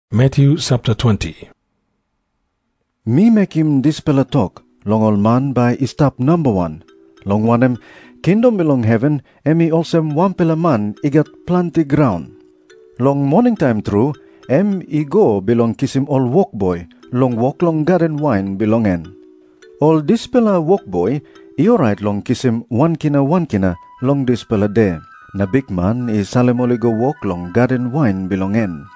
Jisas i tok moa olsem, “Mi mekim dispela tok long ol man bai i stap namba wan, long wanem, kingdom bilong heven em i olsem wanpela man i gat planti graun. Long moningtaim tru em i go bilong kisim ol wokboi long wok long gaden wain bilong en. Ol dispela wokboi i orait long kisim wan kina wan kina long dispela de, na bikman i salim ol i go wok long gaden wain bilong en.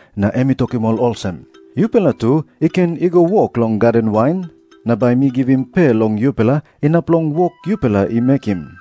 Na em i tokim ol olsem, ‘Yupela tu i ken i go wok long gaden wain, na bai mi givim pe long yupela inap long wok yupela i mekim.’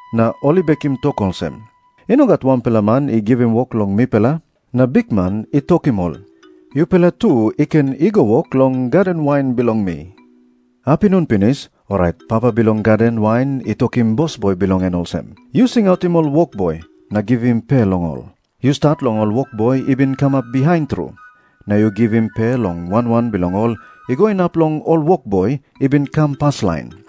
Na ol i bekim tok olsem, ‘I no gat wanpela man i givim wok long mipela.’ Na bikman i tokim ol, ‘Yupela tu i ken i go wok long gaden wain bilong mi.’ “Apinun pinis, orait papa bilong gaden wain i tokim bosboi bilong en olsem, ‘Yu singautim ol wokboi na givim pe long ol. Yu stat long ol wokboi i bin kamap bihain tru, na yu givim pe long wan wan bilong ol i go inap long ol wokboi i bin kam paslain.’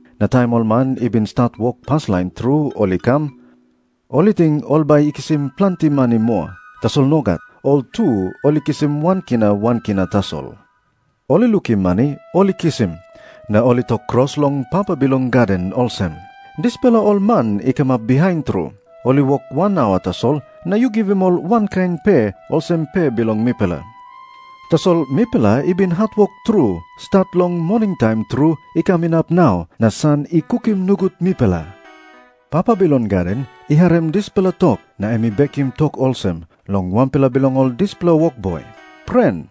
Na taim ol man i bin stat wok paslain tru ol i kam, ol i ting ol bai i kisim planti mani moa. Tasol nogat. Ol tu ol i kisim wan kina wan kina tasol. Ol i lukim mani ol i kisim, na ol i tok kros long papa bilong gaden olsem, ‘Dispela ol man i kamap bihain tru, ol i wok wan aua tasol, na yu givim ol wankain pe olsem pe bilong mipela. Tasol mipela i bin hatwok tru stat long moningtaim tru i kam inap nau, na san i kukim nogut mipela.’ “Papa bilong gaden i harim dispela tok na em i bekim tok olsem long wanpela bilong ol dispela wokboi, ‘Pren,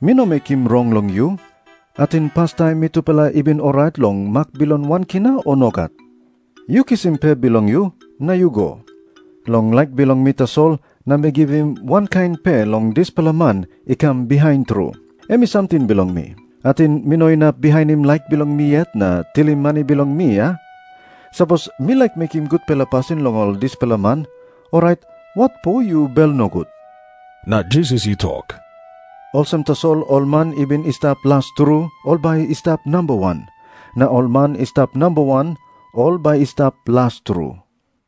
mi no mekim rong long yu. Ating pastaim mitupela i bin orait long mak bilong wan kina, o nogat? Yu kisim pe bilong yu na yu go. Long laik bilong mi tasol, na mi givim wankain pe long dispela man i kam bihain tru. Em i samting bilong mi. Ating mi no inap bihainim laik bilong mi yet na tilim mani bilong mi, a? Sapos mi laik mekim gutpela pasin long ol dispela man, orait watpo yu bel nogut?’” Na Jisas i tok, “Olsem tasol ol man i bin i stap las tru ol bai i stap namba wan. Na ol man i stap namba wan, ol bai i stap las tru.”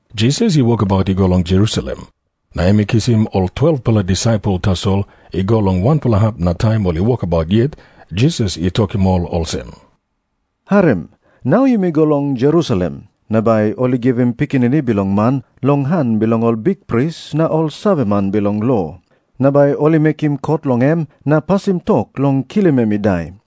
Jisas i wokabaut i go long Jerusalem. Na em i kisim ol 12-pela disaipel tasol i go long wanpela hap na taim ol i wokabaut yet Jisas i tokim ol olsem, “Harim. Nau yumi go long Jerusalem. Na bai ol i givim Pikinini Bilong Man long han bilong ol bikpris na ol saveman bilong lo. Na bai ol i mekim kot long em na pasim tok long kilim em i dai.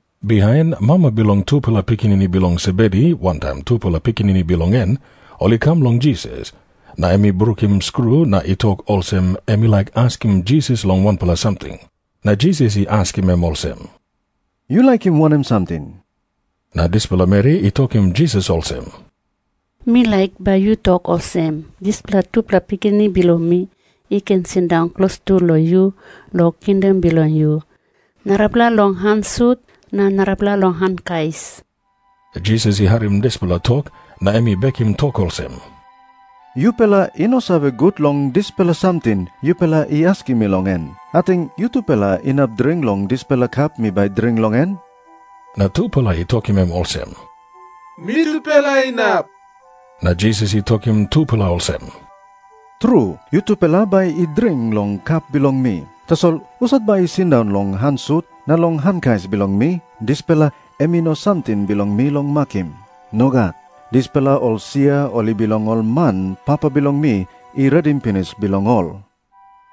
Bihain mama bilong tupela pikinini bilong Sebedi wantaim tupela pikinini bilong en, ol i kam long Jisas. Na em i brukim skru na i tok olsem em i laik askim Jisas long wanpela samting. Na Jisas i askim em olsem, “Yu laikim wanem samting?” Na dispela meri i tokim Jisas olsem, “Mi laik bai yu tok olsem dispela tupela pikinini bilong mi i ken sindaun klostu long yu long kingdom bilong yu, narapela long han sut na narapela long han kais.” Jisas i harim dispela tok na em i bekim tok olsem, “Yupela i no save gut long dispela samting yupela i askim mi long en. Ating yutupela inap dring long dispela kap mi bai dring long en?” Na tupela i tokim em olsem, “Mitupela inap.” Na Jisas i tokim tupela olsem, “Tru, yutupela bai i dring long kap bilong mi. Tasol husat bai i sindaun long han sut na long han kais bilong mi, dispela em i no samting bilong mi long makim. Nogat. Dispela ol sia ol i bilong ol man Papa bilong mi i redim pinis bilong ol.”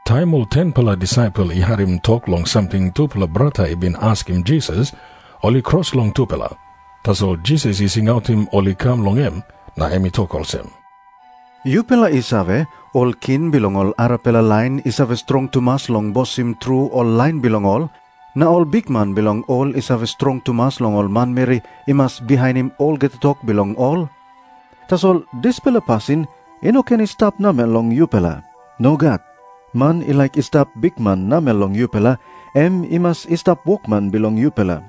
Taim ol 10-pela disaipel i harim tok long samting tupela brata i bin askim Jisas, ol i kros long tupela. Tasol Jisas i singautim ol i kam long em, na em i tok olsem, “Yupela i save, ol king bilong ol arapela lain i save strong tumas long bosim ol lain bilong ol. Na ol bikman bilong ol i save strong tumas long ol manmeri i mas bihainim olgeta tok bilong ol. Tasol dispela pasin i no ken i stap namel long yupela. Nogat. Man i laik i stap bikman namel long yupela, em i mas i stap wokman bilong yupela.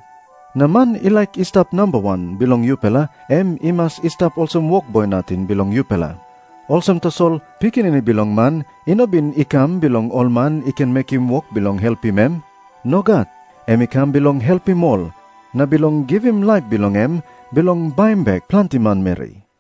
Na man i laik i stap namba wan bilong yupela, em i mas i stap olsem wokboi nating bilong yupela. Olsem tasol Pikinini Bilong Man i no bin i kam bilong ol man i ken mekim wok bilong helpim em. Nogat. Em i kam bilong helpim ol, na bilong givim laip bilong em bilong baim bek planti manmeri.”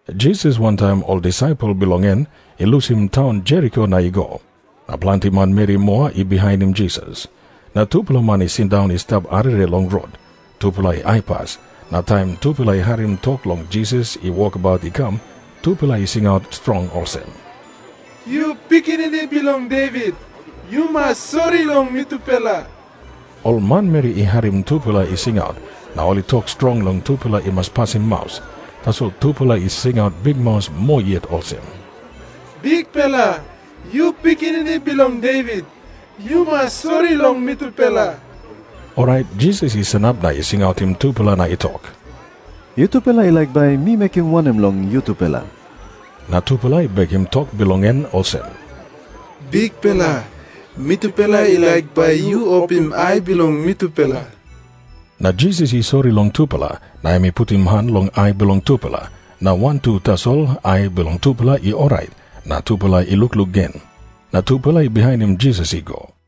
Jisas wantaim ol disaipel bilong en i lusim taun Jeriko na i go. Na planti manmeri moa i bihainim Jisas. Na tupela man i sindaun i stap arere long rot. Tupela i aipas, na taim tupela i harim tok long Jisas i wokabaut i kam, tupela i singaut strong olsem, “Yu Pikinini Bilong Devit, yu mas sori long mitupela.” Ol manmeri i harim tupela i singaut na ol i tok strong long tupela i mas pasim maus, tasol tupela i singaut bikmaus moa yet olsem, “Bikpela, yu Pikinini Bilong Devit, yu mas sori long mitupela.” Orait Jisas i sanap na i singautim tupela na i tok, “Yutupela i laik bai mi mekim wanem long yutupela?” Na tupela i bekim tok bilong en olsem, “Bikpela, mitupela i laik bai yu opim ai bilong mitupela.” Na Jisas i sori long tupela, na em i putim han long ai bilong tupela, na wantu tasol ai bilong tupela i orait na tupela i lukluk gen. Na tupela i bihainim Jisas i go.